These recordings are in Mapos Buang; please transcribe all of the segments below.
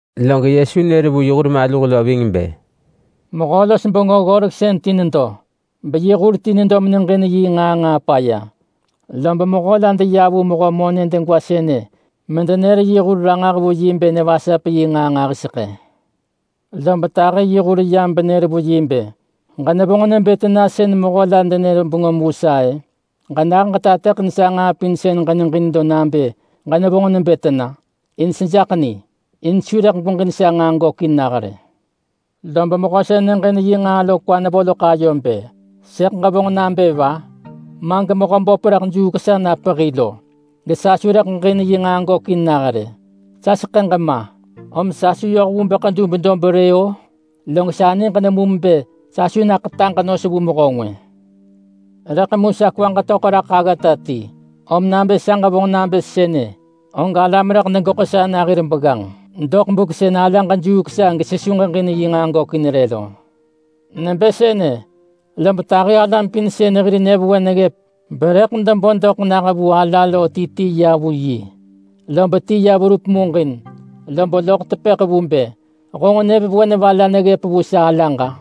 Log Yesu nër vu yi hur maluh lo ving bë, “Mehö-los-bengö-ggoreksën ti nedo, beyi hur ti nedo meneġin yi nġaa nġaa paya. Lob mehö la deya vu mehö monë degwa sënë medenër yi hur ranġah vu yi bë nevasap yi nġaa nġahiseḳë. Lob tahi yi hur yam benër vu yi bë, ‘Ġenevonġ nebë tena sën mehö la denër bengöm vu sa-ë? Ġenah ġetateḳin sa nġaa pin sën ġeneġin lo nabë ġenevonġ nebë tena, in sejaḳ ni. In su rëḳ gweġin sa nġaa gökin nah rë.’ Lob mehö sën neġin yi nġaa lo kwa nevo loḳ ayo bë, ‘Sëḳ ġevonġ nabë va? Ma gemehö böp rëḳ juuk sa na pehi lo, gesa su rëḳ ġeġin yi nġaa gökin nah rë. Sa seḳëġ ma, om sa su yoh vu bë ḳedub dob rë-o! Log sa niġ nemum bë sa su ḳetaġ nos vu mehö ngwë. Rëḳ mu sa kwaġ töḳ raḳ aggata ti, om nabë sa ġevonġ nabë sënë, og alam rëḳ degeḳo sa na hir begganġ doḳ buk sën sa alaġ juuk sa gesesu ġeġin yi nġaa gökin rë lo.’ Nebë sënë lob tahi alam pin sën hir nyëvewen neggëp berëḳ debo doḳ nah vu ala lo ti ti ya vu yi. Lob ti ya verup muġin, lob loḳ tepëḳ vu bë, ‘Honġ nyëvewen va la neggëp vu sa alaġ-a?’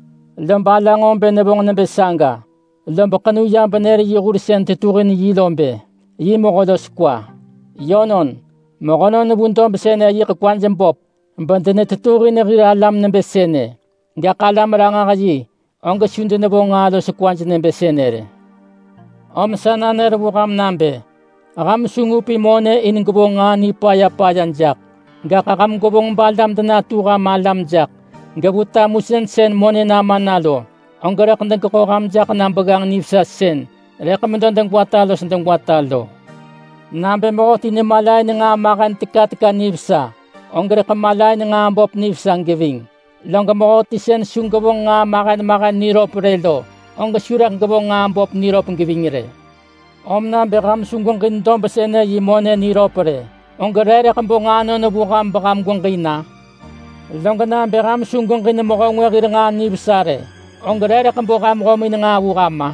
Lob ala nġo bë nevonġ nebë saga, lob ḳenu ya benër yi hur sën tetuhin yi lo bë yi mehö los kwa. Yönon, mehönon vu dob sënë yiḳ kwaj böp bedenetetuhin hir alam nebë sënë. Gaḳ alam-ranġah-yi, og su denevonġ nġaa los kwa nebë sënë rë. Om sa nanër vu ham nabë: Ham su ngupin monë in gwevonġ nġaa nipaya paya jaḳ, gaḳ ham gwevonġ balam denatu ham alam jaḳ. Gevu tamusën sën monë nama na lo, og rëḳ degeḳo ham jaḳ na begganġ nivesa sën rëḳ medo degwata los degwata lo. Nabë mehöti nemalain nġaa mahen teka teka nivesa, og rëḳ malain nġaa böp nivesa geving. Log mehöti sën su gevonġ nġaa mahen mahen niröp rë lo, og su rëḳ gevonġ nġaa böp niröp geving rë. Om nabë ham su gweġin dob sënë yi monë niröp rë, og re rëḳ bo nġaanon vu ham beham gweġin-a? Log nabë ham su gweġin mehö ngwë hir nġaa nivesa rë, og re rëḳ bo ham nġo ham nġaa sën lo vu ham-a?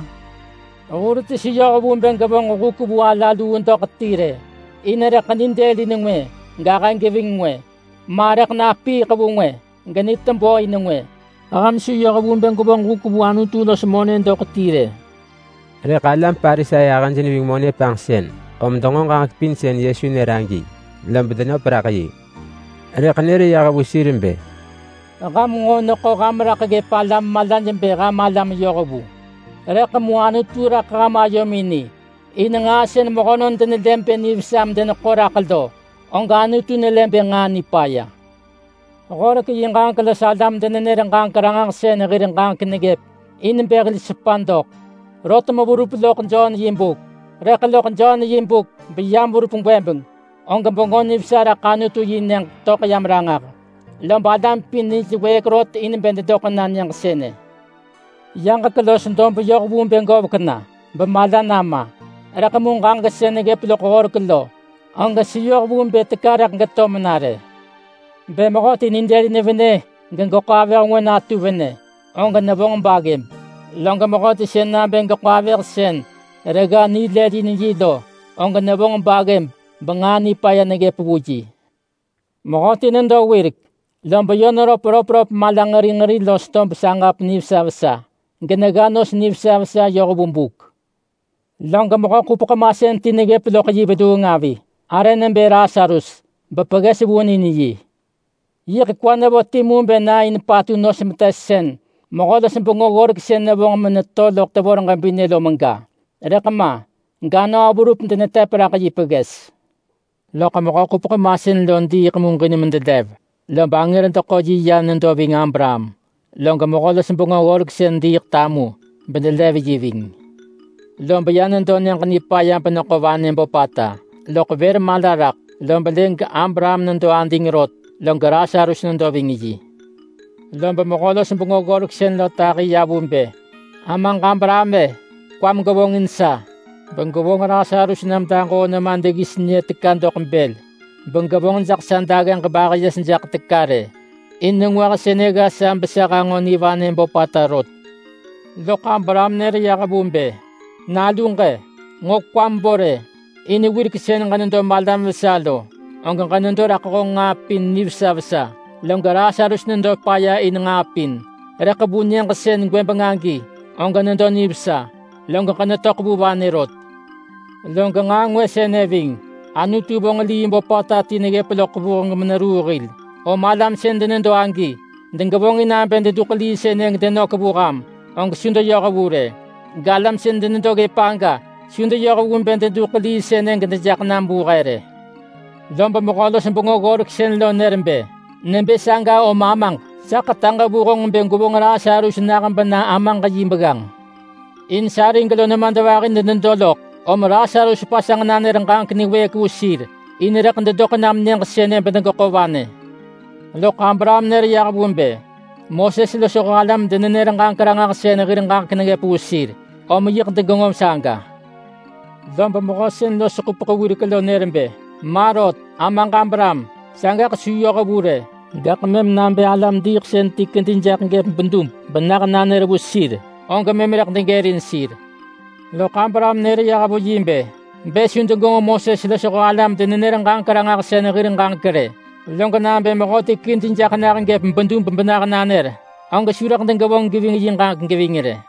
Hur ti su yoh vu bë gevonġ huk vu ala luu doḳ ti rë. In rëḳ nidelin ngwë, gahë geving ngwë. Ma rëḳ napiiḳ vu ngwë, genitebö in ngwë. Ham su yoh vu bë gwevonġ huk vu Anutu los monë doḳ ti rë.” Rëḳ alam Parisai ahëj neving monë panġsën, om denġo ġaġek pin sën Yesu nër agi, lob denöp raḳ yi. Rëḳ nër yah vu sir bë, “Ham nġo neḳo ham raḳ ggëp alam malaj bë ham alam yohvu. Rëḳ mu Anutu raḳ ham ayomin ni. In nġaa sën mehönon denelë bë nivesa medeneḳo raḳ lo, og Anutu nelë bë nġaa nipaya. Horek yi ġaġek los alam-denenër-ġaġek-ranġahsën hir ġaġek neggëp in bë hil sepa doḳ, rot meverup loḳ Jon yi buk. Rëḳ loḳ Jon yi buk, beyam verup gwëbeng, og Bengö Nivesa raḳ Anutu-yi-nyëġ töḳ yam ranġah. Lob alam pin nij wëëk rot in bë dedoḳ na nyëġ sënë. Yaġek los dob yoh vu bë govek na bemala nama, rëḳ mu ġaġek sën neggëp loḳ horek lo, og su yoh vu bë teka rëḳ geto mena rë.” “Bë mehöti nidëlin venë gegeḳo avëh ngwë natu venë, og nevonġ baggëb. Log mehöti sën nabë geḳo avëh sën regga nilëlin yi lo, og nevonġ baggëb benġaa nipaya neggëp vu yi.” “Mehöti nedo wirek, lob yö neröp röpröp malanġeri nġeri los tob saġap nivesa vesa. Genegga nos nivesa vesa yoh vu buk. Log mehö-ḳupeḳ-masën ti neggëp loḳ yi veluung avi, arë nebë Lasarus. Bepegges vunin yi. Rëḳ kwa nevo timu bë na in patu nos metes sën mehö-los-bengö-ggoreksën nevonġ meneto loḳ tevor ġebinë lo mega, rëḳ ma. Ganöö verup denetep raḳ yi pegges. Loḳ mehö-ḳupeḳ-masën lo diiḳ muġin medelev, lob angër deḳo yi ya nedo ving Abraham. Log mehö-los-bengö-ggoreksën diiḳ tamu bedelev yi ving. Lob ya nedo Nyëġ-nipaya beneḳo vanë böpata. Loḳ vër mala raḳ, lob lë ga, Abraham nedo ading rot, log Lasarus nedo ving yi. Lob mehö-los-bengö-ggoreksën lo tahi ya vu bë, ‘Amaġ Abraham-e! Kwam gevonġin sa begwevonġ Lasarus nam daġoo nema deggis nyë teka doḳ bël, begevonġ jaḳ sa daggeġ bahë yes jaḳ teka rë. In nengwah sënë gga sa besa hanġo nivanë böpata rot.’ Loḳ Abraham nër yah vu bë, ‘Naluġ-e! Nġo kwam bo rë! In wirek sën ġenedo malam vesa lo, og ġenedo raḳ honġ nġaa pin nivesa vesa. Log Lasarus nedo paya in nġaa pin. Rëḳ vu nyëġ sën gwëbeng agi, og nedo nivesa, log ġenetöḳ vu vanë rot. Log nġaa ngwë sënë ving. Anutu vonġ lii böpata ti neggëp loḳ vuheng meneruu hil. Om alam sën denedo agi degevonġin nabë deduḳ lii sënë gedenök vu ham, og su deyoh vu rë. Galam sën denedo ggëp aga su deyoh vu bë deduḳ lii sënë gedejaḳ nam vu he rë.’ Lob mehö-los-bengö-ggoreksën lo nër bë, ‘Nebë saga om amaġ, sa ḳetaġ vu honġ bë gwevonġ Lasarus nah bena amaġ yi begganġ. In sarig lo nemadvahi denedo loḳ. Om Lasarus pasanġ nanër ġaġek niwëëk vu sir. In rëḳ dedoḳ nam nyëġ sënë bedegeḳo vanë.’ Loḳ Abraham nër yah vu bë, ‘Moses losho alam-denenër-ġaġek-ranġahsën hir ġaġek neggëp vu sir. Om yiḳ degenġo saga.’ Lob mehö sën los ḳupeḳ wirek lo nër bë, ‘Ma rot! Amaġ Abraham, sagaḳ su yoh vu rë. Gaḳ mëm nabë alam-diiḳsën ti kedi jaḳ gëp bedub benah nanër vu sir, og mëm rëḳ degërin sir.’ Loḳ Abraham nër yah vu yi bë, ‘Bë su degenġo Moses losho alam-denenër-ġaġek-ranġahsën hir ġaġek rë, log nabë mehöti kedi jaḳ nah gëp bedub benah nanër, og su rëḳ degevonġ geving yi ġaġek geving rë.’”